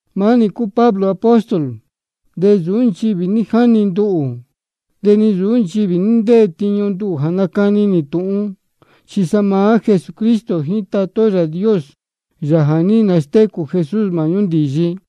Maá nī cúu Pablo apóstol. De nsūú nchivī ní jáni nduhū, de ni nsūú nchivī ní ntétíñú nduhū jā nácani nī tūhun, chi sa maá Jesucristo jíín Tatá ó Yāā Dios, Yāā jā ní nastécū Jesús māhñú ndīyi.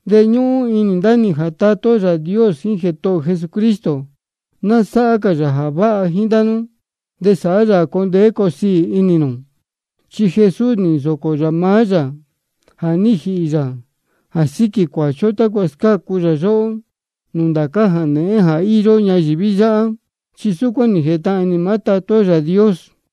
De ñúhún inī ndá nī jā Tatá ó Yāā Dios jíín Jētohō ō Jesucristo, ná sáhá cā yā jā váha ndá nú, de sāhá yā jā coo ndeé coo siī inī nū. Chi Jesús nī nsōcō yā maá yā jā ní jīhī yā jā síquī cuāchi ó, tácua scácu yā yóhó nūū ndācá jā nēhén jā íyó ñayīví yáhá, chi súcuán nī jētahān inī maá Tatá ó Yāā Dios.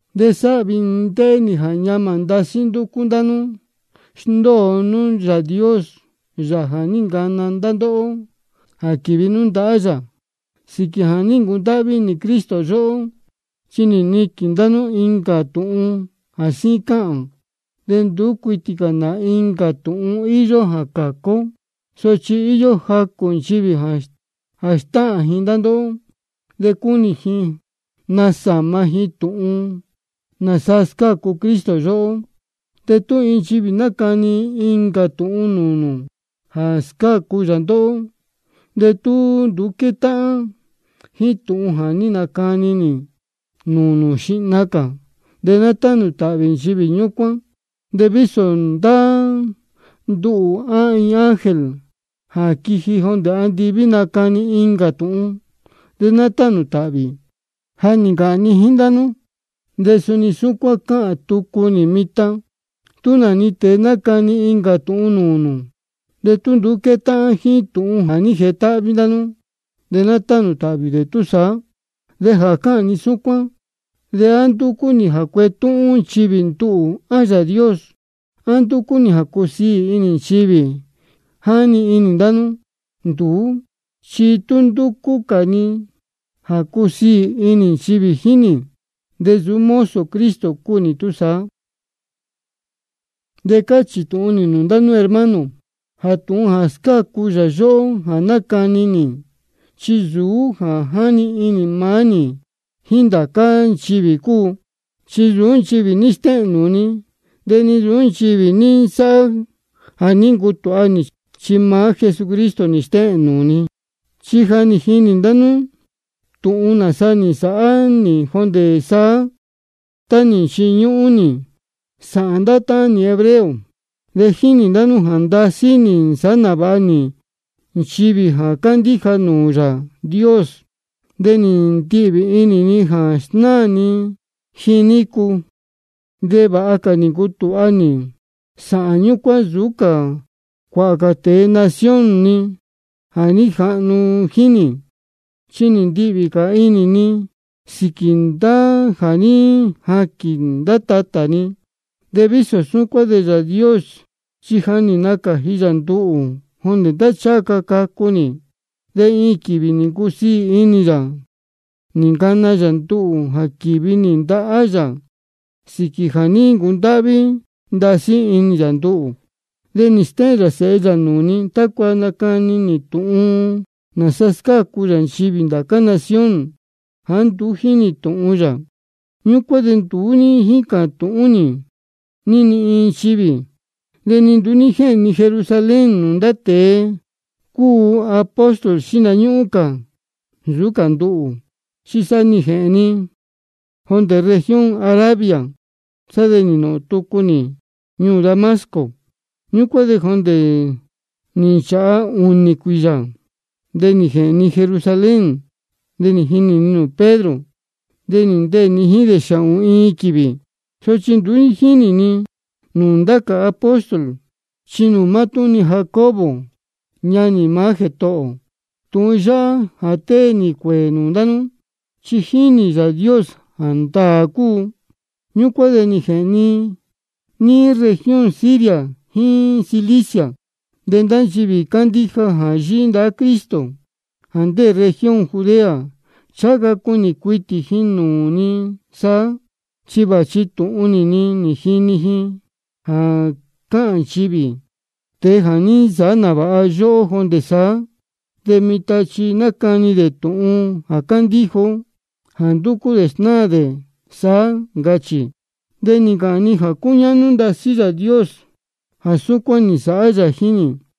De sáhvi inī ni ndéhé nī jā ñamā ndasí ndúcú ndá nú sndóo nú Yāā Dios, Yāā jā ní ncana ndá ndóhó jā quīvi nú ndahá yā sīquī jā ní ncundáhví inī Cristo yóhó. Chi nī niquīn ndá nú incā tūhun jā síín cáhān. De nduú cuitī cā nā incā tūhun íyó jā cācu ó. Sochi íyó jacū nchivī jā stáhān ji ndá ndóhó, de cúnī ji nasāma ji tūhun nāsa scácu Cristo yóhó. De tú iin nchivī nacani incā tūhun nūū nū jā nāsa scácu yā ndóhó, de tú nduú quétáhán jíín tūhun jā ní nacani ndá nī nūū nū xihna cā, de ná tánū tāhvī nchivī ñúcuán. De vísō ndá nduhū á iin ángel jā quiji jondē andiví nacani incā tūhun, de ná tánū tāhvī. Ja nī ncāhān ni jíín ndá nú, de suni súcuán cáhān tucu nī mitan: Tú nā-ni tēe nacani incā tūhun nūū nū, de tú nduú quétáhán jíín tūhun jā ní jetáhví ndá nú, de ná tánū tāhvī dē túsaá. De jā cáhān ni súcuán, ¿de á ndúcú nī jā cuetúhún nchivī nduhū, á Yāā Dios? ¿A ndúcú nī jā cusiī inī nchivī jíín nī, jáni inī ndá nú? Nduú chi tú ndúcú cā ni jā cusiī inī nchivī jíín nī, de nsūú mozo Cristo cúu nī túsaá. De cáchī tūhun nī nūū ndá nú, hermano, jā tūhun jā scácu yā yóhó jā nácani nī, chi nsūú jā ní jani inī maá nī jíín ndá cā nchivī cúu. Chi nsūú nchivī ní stéhēn nūū ni, de ni nsūú nchivī ní nsáhá jā ní ncutūha nī, chi sa maá Jesucristo nī stéhēn nūū ni. Chi ja nī jini ndá nú tūhun nāsa nī nsāhá nī jondē saá, tá nī nchiñúhún nī sāhān ndá táhán nī hebreo. De jínī ndá nú jā ndasí nī nsāhá nāvāha nī nchivī jā cándíja nūū Yāā Dios, de nī ndihvī inī ni jā snáā ni ji nícu. De vāha cā nī ncutūha nī sāhān ñúcuán nsūú cā cuāhā cā tēe nación ni jā ní jahnu jíín nī, chi nī ndihvī cā inī ni sīquī ndá jā ní jaquīn ndá tatā ni. De vísō súcuán de Yāā Dios chi ja nī nacāji yā nduhū jondē tá ncháha ca cacu nī. De iin quīvī nī ncusiī inī yā nī ncana yā nduhū jā quīvi nī ndahá yā sīquī jā ní ncundáhví ndasí inī yā nduhū. De nī stéhēn yā Sēhe yā nūū ni, tácua nacani nī tūhun nāsa scácu yā nchivī ndācá nación jāá nduú jínī tūhun yā. Ñúcuán de nduú ní jícā tūhún nī ni iin nchivī, de ni nduú ní jéhēn ni Jerusalén nūū ndá tēe cúu apóstol xihna ñúhún cā nsūú cā nduhū. Chi sa nī jēhēn ni jondē región Arabia, de sá de nī nōhōn tucu nī ñuū Damasco. Ñúcuán de jondē nī nchāha ūnī cuīyā, sá de nī jēhēn ni Jerusalén. De nī jinī ni nūū Pedro, de nī ndeē ni jíín dē xāhōn-ni quīvī. Sochi nduú ní jínī ni nūū ndá cā apóstol, chi nūū mátúhún-ni Jacobo ñanī maá Jētohō ō. Tūhun yáhá jā tée nī cuēē nūū ndá nú, chi jínī Yāā Dios jā ndāā cúu. Ñúcuán de nī jēhēn ni níí región Siria jíín Cilicia. De ndá nchivī cándíja jā yíhí ndahá Cristo, jā ndéē región Judea, ncháha ca cunī cuitī ji nūū ni saá. Chi vāchi tūhun nī-ni nī jini ji jā cáhān nchivī: Tēe jā ní nsāhá nāvāha yóhó jondē saá, de mitan chi nácani dē tūhun jā cándíja ó jā ndúcú dē snáā dē saá, ncachī. De nī ncāhān ji jā cúñáhnú ndasí Yāā Dios jā súcuán nī nsāhá yā jíín nī.